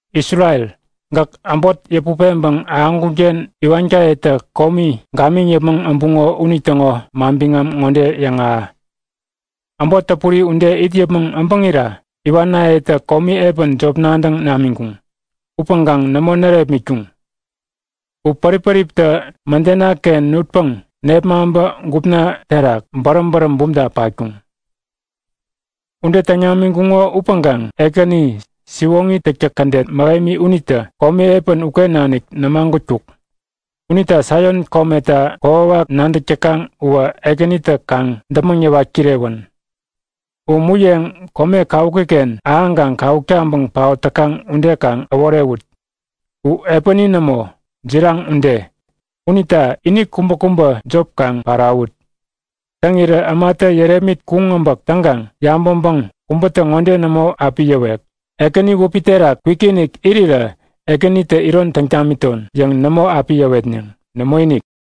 Isrel, gäk äbot yäput peŋpäŋ ahäŋkunken iwankayetä komi gamiŋ yäpmäŋ äbuŋo unitäŋo manbiŋam ŋode yäŋahä; Äbot täpuri ude it yäpmäŋ äbäŋira iwanayetä komi epän jop nadäŋ namiŋkuŋ. Upäŋkaŋ nämo närepmitkuŋ! U pärip-päriptä mädenaken nutpäŋ nepmaŋpä gupna terak bäräm bäräm bumta patkuŋ. Ude täŋ namiŋkuŋo upäŋkaŋ Ekäni siwoŋi täktäk kädet mähemi unitä komi epän uken nanik nämagutkuk. Unita Saion kometa kokwawak nadäk täkaŋ uwä Ekänitä kaŋ däpmäŋ yäwat kirewän! U muyeŋ kome kawukiken ahäŋkaŋ kawuk taŋpäŋ paot täkaŋ ude kaŋ äworewut. U epäni nämo, jiraŋ ude. Unita ini kubäkubä jop kaŋ parawut. Täŋirä ämatä yärepmit kuŋ äbäk täŋkaŋ yabäŋpäŋ kubätä ŋode nämo api yäwek; Ekäni wäpi terak kwikinik irirä Ekänitä iron täŋ tamiton yäŋ nämo api yäwetneŋ. Nämoinik!